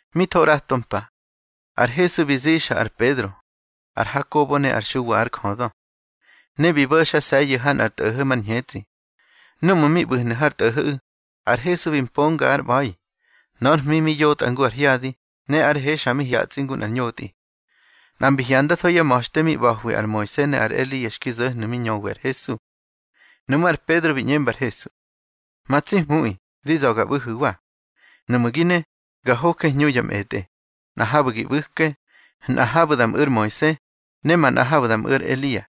Mi tho ꞌrato mpa, ar Hesu bi zixa ar Pedro, ar Hakobo ne ar Xuwa ár jödö, ne bi bo̱xase̱yu̱ ha nꞌar tꞌo̱ho̱ mar ñhetsꞌi. Núꞌmu̱ mi ꞌbu̱hnu̱ har tꞌo̱ho̱ꞌu̱, ar Hesu bi mponga ár ꞌba̱i. Nor hmi mi yotꞌa ngu ar hyadi, ne ár he xa mi hyatsꞌi ngu nꞌar ñotꞌi. Nꞌa mbi hyandatho yá ma̱xte mi ꞌba̱hwi ar Moise ne ar Elia xki zo̱hnu̱ mi ñöwi ar Hesu. Nuꞌmú̱ ar Pedro bi ꞌñemba ar Hesu: —Ma tsi Hmuꞌi, di za̱ ga ꞌbu̱hu̱wa. Nuꞌmu̱ gi ne, ga hoje hñu ya mꞌetꞌe, nꞌa habu̱ gi ꞌbu̱ke, nꞌa habu̱ da mꞌu̱ ar Moise, ne manꞌa habu̱ da mꞌu̱ ar Elia.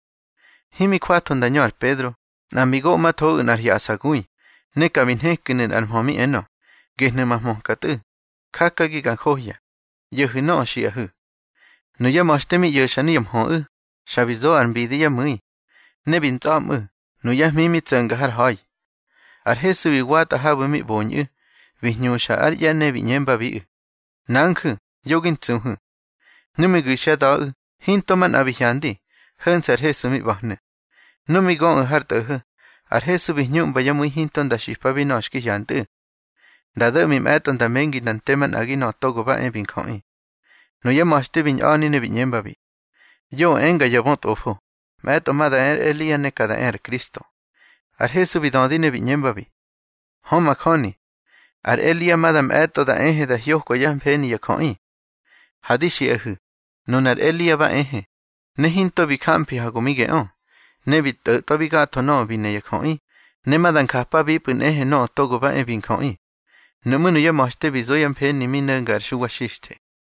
Himi jwatho nda ñö ar Pedro, nꞌa mbi goꞌmathoꞌu̱ nꞌar hyaꞌsagui, ne ka bi nhekinu̱ nꞌar mhö mi enö: —Gehnu̱ ma hmöka Tꞌu̱, jakagi ga njohya. ꞌYo̱hu̱ nöꞌö xiꞌahu̱. Nuyá ma̱xte mi ꞌyo̱xa nuya mhöꞌu̱, xa bi zo ar mbidi yá mu̱i, ne bi ntsꞌa̱mꞌu̱, nuyá hmi mi tso̱nga har ha̱i. Ar Hesu bi watꞌa habu̱ mi ꞌboñꞌu̱, bi hñuxa ár ꞌye̱ ne bi ꞌñembabiꞌu̱: —Nanju̱, yo gi ntsuhu̱. Nu mi gu̱xyá da̱ꞌu̱, hinto manꞌa bi hyandi, ho̱nse̱ ar Hesu mi ꞌba̱hnu̱. Nu mi göꞌu̱ har tꞌo̱ho̱, ar Hesu bi hñuꞌmba yá mu̱i hinto nda xipabi nöꞌö xki hyantꞌu̱. Nda do̱ꞌmi mꞌe̱tꞌo nda mengi nda nte manꞌagi Nöꞌö Togo ba e bi Njöꞌi. Nuyá ma̱xte bi ñꞌa̱ni ne bi ꞌñembabi: —Yoꞌö enga ya bötꞌofo, mꞌe̱tꞌo ma da e ar Elia ne ka da e ar Kristo. Ar Hesu bi dödi ne bi ꞌñembabi: —Hö majöni, ar Elia ma da mꞌe̱tꞌo da ehe da hyokwa yá mfeni ya jöꞌi. Ha di xiꞌahu̱, nunar Elia ba ehe, ne hinto bi jamfi ha go mi geꞌö. Ne bi tꞌo̱tꞌwabi gatho nöꞌö bi ne ya jöꞌi, ne ma da njapabipꞌu̱ nꞌehe Nöꞌö Togo ba e bi Njöꞌi. Nuꞌmú̱ nuyá ma̱xte bi zo yá mfeni mi no̱nga ar Xuwa Xixthe.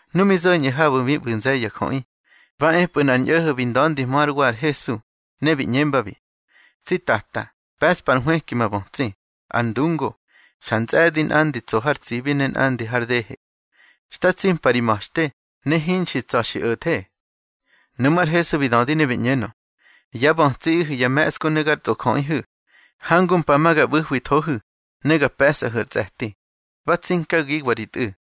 Nu mi zo̱ñꞌu̱ habu̱ mi ꞌbu̱ nze̱ye̱ ya jöꞌi, ba epꞌu̱ nꞌar ñꞌo̱ho̱ bi nda̱ndihmö hár wa ar Hesu, ne bi ꞌñembabi: —Tsi Tata, pe̱ꞌspa ar nhwëki ma bötsi, ar ndungo. Xa ntsꞌe̱di, nꞌandi tso har tsibi ne nꞌandi har dehe. Xta tsimpa ri ma̱xte, ne hinxi tsa̱ xi o̱the. Nuꞌmú̱ ar Hesu bi dödi ne bi ꞌñenö: —Yá bötsiꞌihu̱ ya me̱ꞌsku ne gar tsꞌojöꞌihu̱. Hangu mpa ma ga ꞌbu̱hwithohu̱, ne ga pe̱sꞌahu̱ ar tsꞌe̱ti. Ba tsinkagiwa ri tꞌu̱.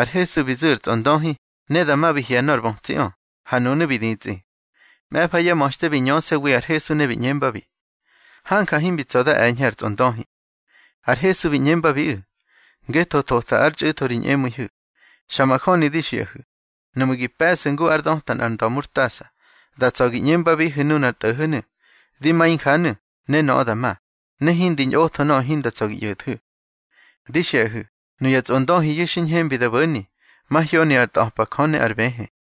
Ar Hesu bi zu̱ ar tsꞌondöhi, ne dama bi hye̱ nor bötsiꞌö, ha nunu̱ bi ditsꞌi. Mꞌe̱fa yá ma̱xte bi ñöse̱wi ar Hesu ne bi ꞌñembabi: —Hanja himbi tsa̱ da e̱ñhe ar tsꞌondöhi. Ar Hesu bi ꞌñembabiꞌu̱: —Ngetho thota ár txꞌu̱tho ri ñꞌemu̱ihu̱. Xa majöni di xiꞌahu̱, nuꞌmu̱ gi pe̱ꞌsu̱ ngu ár döta nꞌar nda̱murtasa, da tsa̱ gi ꞌñembabihu̱ nunar tꞌo̱ho̱nu̱: Di ma injanu̱, ne nöꞌö da ma, ne hindi ñꞌotho nöꞌö hinda tsa̱ gi ꞌyo̱thu̱. Di xiꞌahu̱, nuya tsꞌondöhiyu̱ xi ñhembi da bo̱ni, mahyoni ar ntꞌa̱pa Jö ne ar bëhë.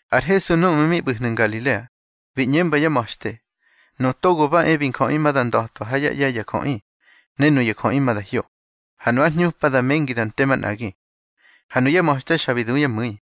Ar Hesu núꞌmu̱ mi ꞌbu̱hnu̱ Ngalilea, bi ꞌñemba yá ma̱xte: —Nöꞌö Togo ba e bi Njöꞌi ma da nda̱twa ha yá ꞌye̱ ya jöꞌi. Ne nuya jöꞌi ma da hyo, ha nu ár hñupa da mengi da nte manꞌagi. Ha nuyá ma̱xte xa bi du yá mu̱i.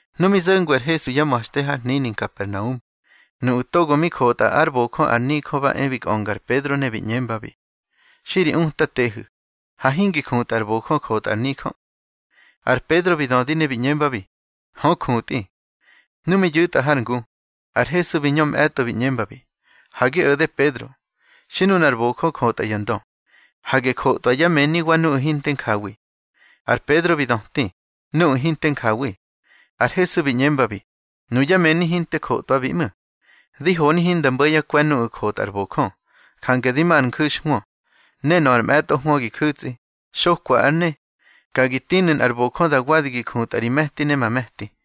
Nu mi zo̱ngwi ar Hesu yá ma̱xte har hnini Nkapernaum, nuꞌu̱ togo mi jotꞌa ár bojö ar nijö ba e bi kꞌönga ar Pedro, ne bi ꞌñembabi: —Xi ri Utatehu̱, ha hingi jutꞌa ar bojö jotꞌa ar nijö. Ar Pedro bi dödi ne bi ꞌñembabi: —Hö jutꞌi. Nu mi yu̱tꞌa har ngu, ar Hesu bi ñö mꞌe̱tꞌo bi ꞌñembabi: —Ha gi o̱de Pedro. Xi nunar bojö jotꞌa ya ndö, hage jotꞌwa yá mëni wa nuꞌu̱ hinte njawi. Ar Pedro bi döti: —Nuꞌu̱ hinte njawi. Ar Hesu bi ꞌñembabi: —Nuyá mëni hinte jotꞌwabi ꞌmu̱. Di honi hinda mbo̱ yá kwe̱ nuꞌu̱ jotꞌa ar bojö, jange di ma ar nju̱xhwö, ne nöꞌö ar mꞌe̱tꞌo hwö gi ju̱tsꞌi, xokwa ár ne, ka gi tinu̱ nꞌar bojö da wadi gi jutꞌa ri me̱ti ne ma me̱ti.